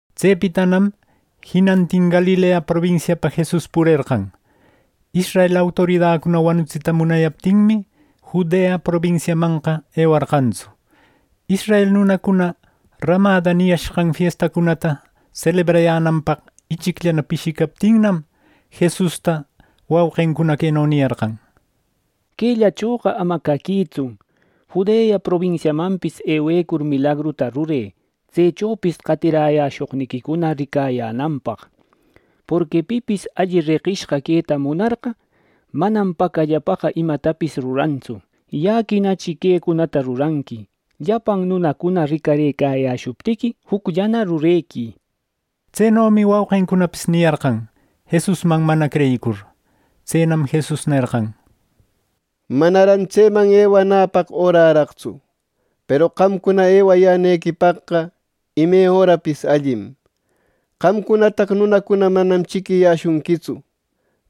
Tsepitanam jinantin Galilea probinsiapa Jesus purerqan. Israel autoridacuna wanutsita munayaptinmi, Judea probinsiamanqa ewarqantsu. Israel nunacuna “rämada” niyashqan fiestancunata selebrayänanpaq ichicllana pishicaptinnam, Jesusta wauqincuna queno niyarqan: —Quellachoqa ama caquïtsu. Judea probinsiamanpis ewecur milagruta rurë tsechopis qatiräshoqniquicuna ricayänanpaq; porqui pipis alli reqishqa queta munarqa, manam pacallapaqa imatapis rurantsu. Yäquinachi quecunata ruranqui; llapan nunacuna ricarëcayäshuptiqui jucllana rurequï —nishpa. Tsenomi wauqincunapis niyarqan, Jesusman mana creyicur. Tsenam Jesus nerqan: —Manaran tseman ewanäpaq öraraqtsu. Peru qamcuna ewayänequipaqqa ime örapis allim. Qamcunataqa nunacuna manam chiquiyäshunquitsu,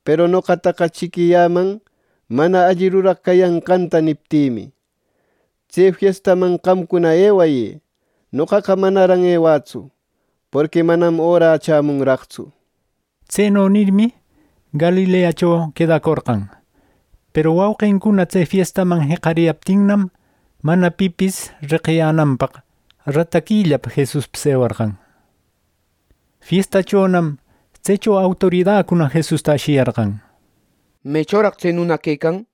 peru noqataqa chiquiyäman, mana alli ruraq cayanqanta niptïmi. Tse fiestaman qamcuna ewayë. Noqaqa manaran ewätsu, porqui manam orä chämunraqtsu —nir. Tseno nirmi, Galileacho quedacorqan. Peru wauqincuna tse fiestaman jeqariyaptinnam, mana pipis reqiyänanpaq, rataquillapa Jesuspis ewarqan. Fiestachonam tsecho autoridacuna Jesusta ashiyarqan: —¿Mechoraq tse nuna quecan? —nishpa.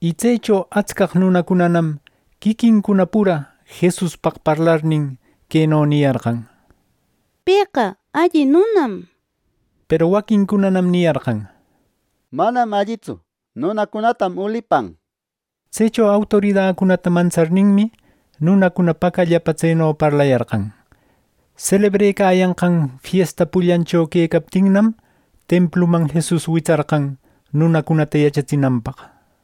Y tsecho atscaq nunacunanam quiquincuna pura Jesuspaq parlarnin, queno niyarqan: “Pëqa alli nunam” nir. Peru waquincunanam niyarqan: “Manam allitsu. Nunacunatam ulipan” nir. Tsecho autoridacunata mantsarninmi, nunacuna pacallapa tseno parlayarqan. Selebrecayanqan fiesta pullancho quecaptinnam, templuman Jesus witsarqan nunacunata yachatsinanpaq.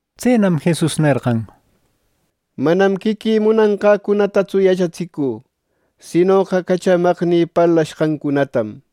Tsenam Jesus nerqan: —Manam quiquï munanqäcunatatsu yachatsicü, sinoqa cachamaqnï parlashqancunatam.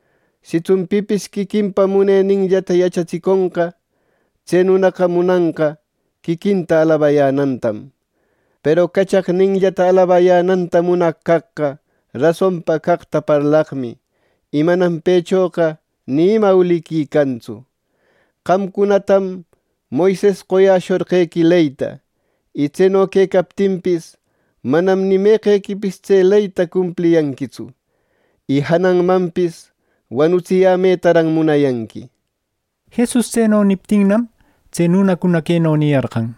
Sitsun pipis quiquinpa muneninllata yachatsiconqa, tse nunaqa munanqa quiquinta alabayänantam. Peru cachaqninllata alabayänanta munaq caqqa rasonpa caqta parlaqmi, y manam pëchoqa ni ima uliqui cantsu. Qamcunatam Moises qoyäshorqequi leyta. Y tseno quecaptinpis, manam ni meqequi tse leyta cumpliyanquitsu. ¡Y jananmanpis, wanutsiyämetaran munayanqui! —nir. Jesus tseno niptinnam, tse nunacuna queno niyarqan: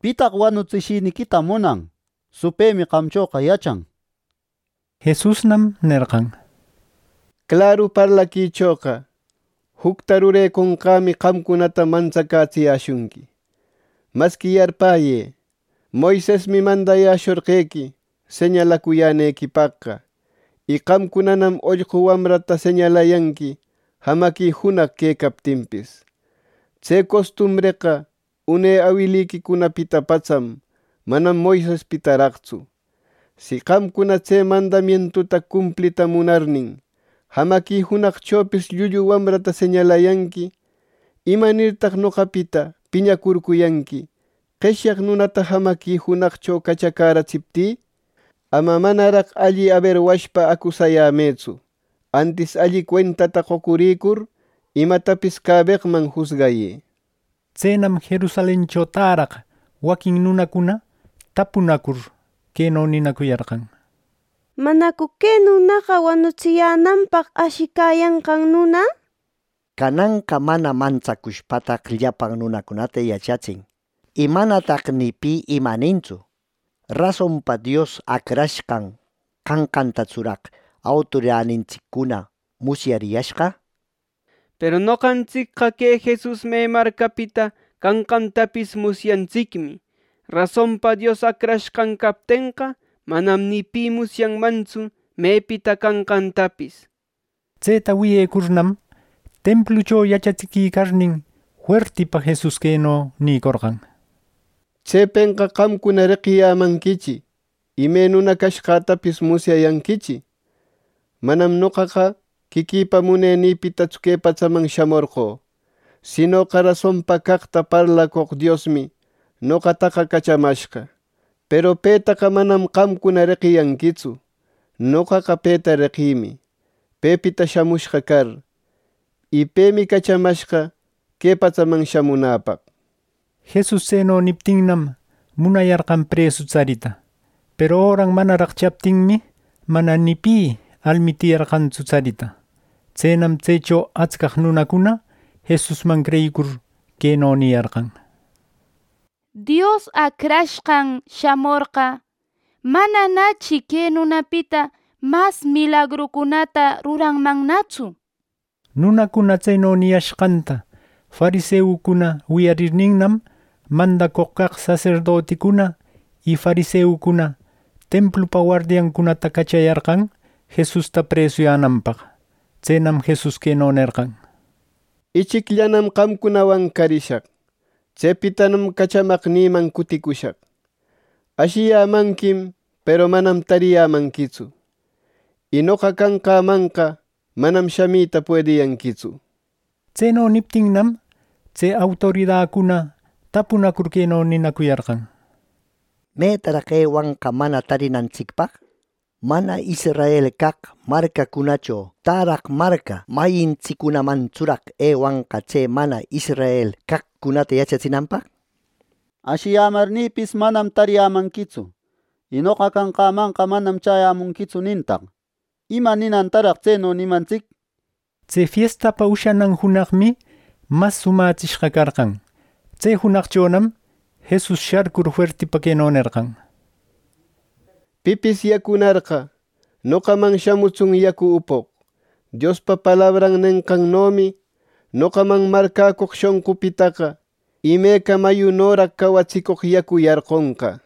—¿Pitaq wanutsishiniquita munan? Supëmi qamchoqa yachan —nishpa. Jesusnam nerqan: —Claru parlaquichoqa, jucta rureconqämi qamcunata mantsacätsiyäshunqui. Masqui yarpäyë: Moisesmi mandayäshorqequi señalacuyänequipaqqa y qamcunanam ollqu wamrata señalayanqui jamaqui junaq quecaptinpis. Tse costumbreqa une awiliquicunapita patsam, manam Moisespitaraqtsu. Si qamcuna, tse mandamientuta cumplita munarnin, jamaqui junaqchopis llullu wamrata señalayanqui, ¿imanirtaq noqapita piñacurcuyanqui, qeshyaq nunata jamaqui junaqcho cachacäratsiptï? Ama manaraq alli aberwashpa acusayämëtsu, antis alli cuentata qocuricur imatapis cabeqman jusgayë —nir. Tsenam Jerusalencho täraq waquin nunacuna tapunacur, queno ninacuyarqan: —¿Manacu que nunaqa wanutsiyänanpaq ashicayanqan nuna? ¡Cananqa mana mantsacushpataq llapan nunacunata yachatsin, y manataq ni pi ima nintsu! ¡Rasonpa Dios Acrashqan canqantatsuraq autoridanintsiccuna musyariyashqa! Peru noqantsicqa que Jesus me marcapita canqantapis musyantsicmi. Rasonpa Dios Acrashqan captenqa, manam ni pi musyanmantsu mepita canqantapis —nishpa. Tseta wiyecurnam, templucho yachatsiquicarnin fuertipa Jesus queno nïcorqan: —¡Tsepenqa qamcuna reqiyämanquichi, y me nuna cashqätapis musyayanquichi! Manam noqaqa quiquïpa munenïpitatsu que patsaman shamorqö, sinoqa rasonpa caqta parlacoq Diosmi noqataqa cachamashqa. Peru petaqa manam qamcuna reqiyanquitsu. Noqaqa peta reqïmi, pepita shamushqa car. Y pemi cachamashqa que patsaman shamunäpaq —nir. Jesus tseno niptinnam, munayarqan presu tsarita. Peru öran manaraq chaptinmi, mana ni pi almitiyarqantsu tsarita. Tsenam tsecho atscaq nunacuna Jesusman creyicur, queno niyarqan: —Dios Acrashqan shamorqa, ¡mananachi que nunapita mas milagrucunata ruranmannatsu! —nir. Nunacuna tseno niyashqanta fariseucuna wiyarirninnam, mandacoq caq saserdoticuna y fariseucuna templupa wardiancunata cachayarqan Jesusta presuyänanpaq. Tsenam Jesus queno nerqan: —Ichicllanam qamcunawan carishaq. Tsepitanam cachamaqnïman cuticushaq. Ashiyämanquim, peru manam tariyämanquitsu; y noqa canqämanqa manam shamita puediyanquitsu —nir. Tseno niptinnam, tse autoridacuna tapunacur queno ninacuyarqan: —¿Metaraq ewanqa mana tarinantsicpaq? ¿Mana Israel caq marcancunacho täraq marca mayintsiccunamantsuraq ewanqa tse mana israel caqcunata yachatsinanpaq? ‘Ashiyämarninpis, manam tariyämanquitsu, y noqa canqämanqa manam chäyämunquitsu’ nintaq. ¿Ima ninantaraq tseno nimantsic? —nir. Tse fiestapa ushanan junaqmi mas somätsishqa carqan. Tse junaqchonam Jesus sharcur, fuertipa queno nerqan: —Pipis yacunarqa, noqaman shamutsun yacu upoq. Diospa palabran nenqannomi, noqaman marcäcoq shonqunpitaqa, imeca mayunoraq cawatsicoq yacu yarqunqa —nir.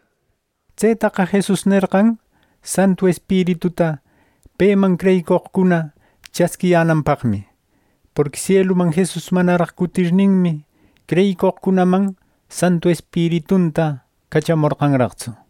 Tsetaqa Jesus nerqan Santu Espirituta peman creyicoqcuna chasquiyänanpaqmi, porqui sieluman Jesus manaraq cutirninmi, creyicoqcunaman Santu Espiritunta cachamorqanraqtsu.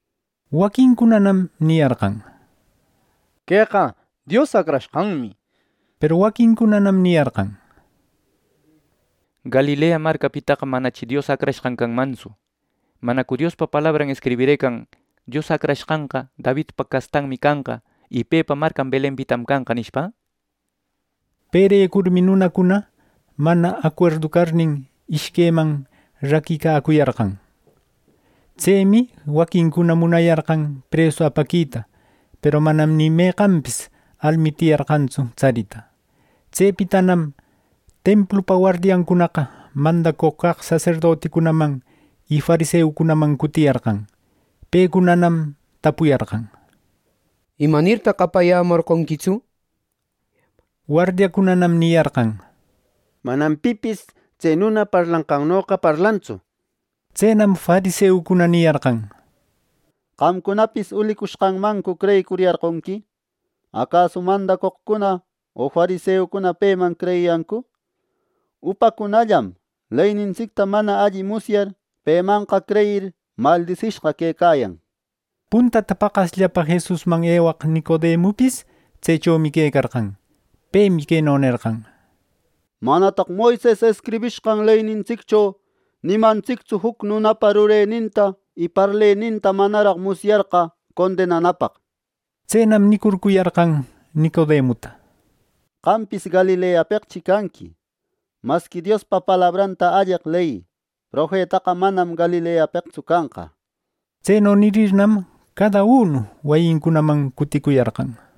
Waquincunanam niyarqan: —Queqa Dios Acrashqanmi —nir. Peru waquincunanam niyarqan: —¡Galilea marcapitaqa manachi Dios Acrashqan canmantsu! ¿Manacu Diospa palabran escribirëcan Dios Acrashqanqa Davidpa castanmi canqa, y pepa marcan Belenpitam canqa! —nishpa. Perecurmi nunacuna mana acuerdu carnin, ishqueman raquicacuyarqan. Tsemi waquincuna munayarqan presu apaquita, peru manam ni meqanpis almitiyarqantsu tsarita. Tsepitanam templupa wardiancunaqa mandacoq caq saserdoticunaman y fariseucunaman cutiriyarqan. Pecunanam tapuyarqan: —¿Imanirtaq apayämorqonquitsu? —nishpa. Wardiacunanam niyarqan: —¡Manam pipis tse nuna parlanqannoqa parlantsu! —nir. Tsenam fariseucuna niyarqan: —¿Qamcunapis ulicushqanmancu creyicuriyarqonqui? ¿Acasu mandacoqcuna o fariseucuna peman creyiyancu! ¡Upacunallam, leynintsicta mana alli musyar, pemanqa creyir, maldisishqa quecayan! —nir. Puntata paqasllapa Jesusman ewaq Nicodemupis tsechomi quecarqan. Pemi queno nerqan: —¿Manataq Moises escribishqan leynintsiccho nimantsictsu juc nunapa rureninta y parleninta manaraq musyarqa condenanapaq! —nir. Tsenam nicurcuyarqan Nicodemuta: —¿Qampis Galileapeqchi canqui! Masqui Diospa palabranta alleq leyï. Profetaqa manam Galileapeqtsu canqa —nir. ˻Tseno nirirnam, cadaunu wayincunaman cuticuyarqan.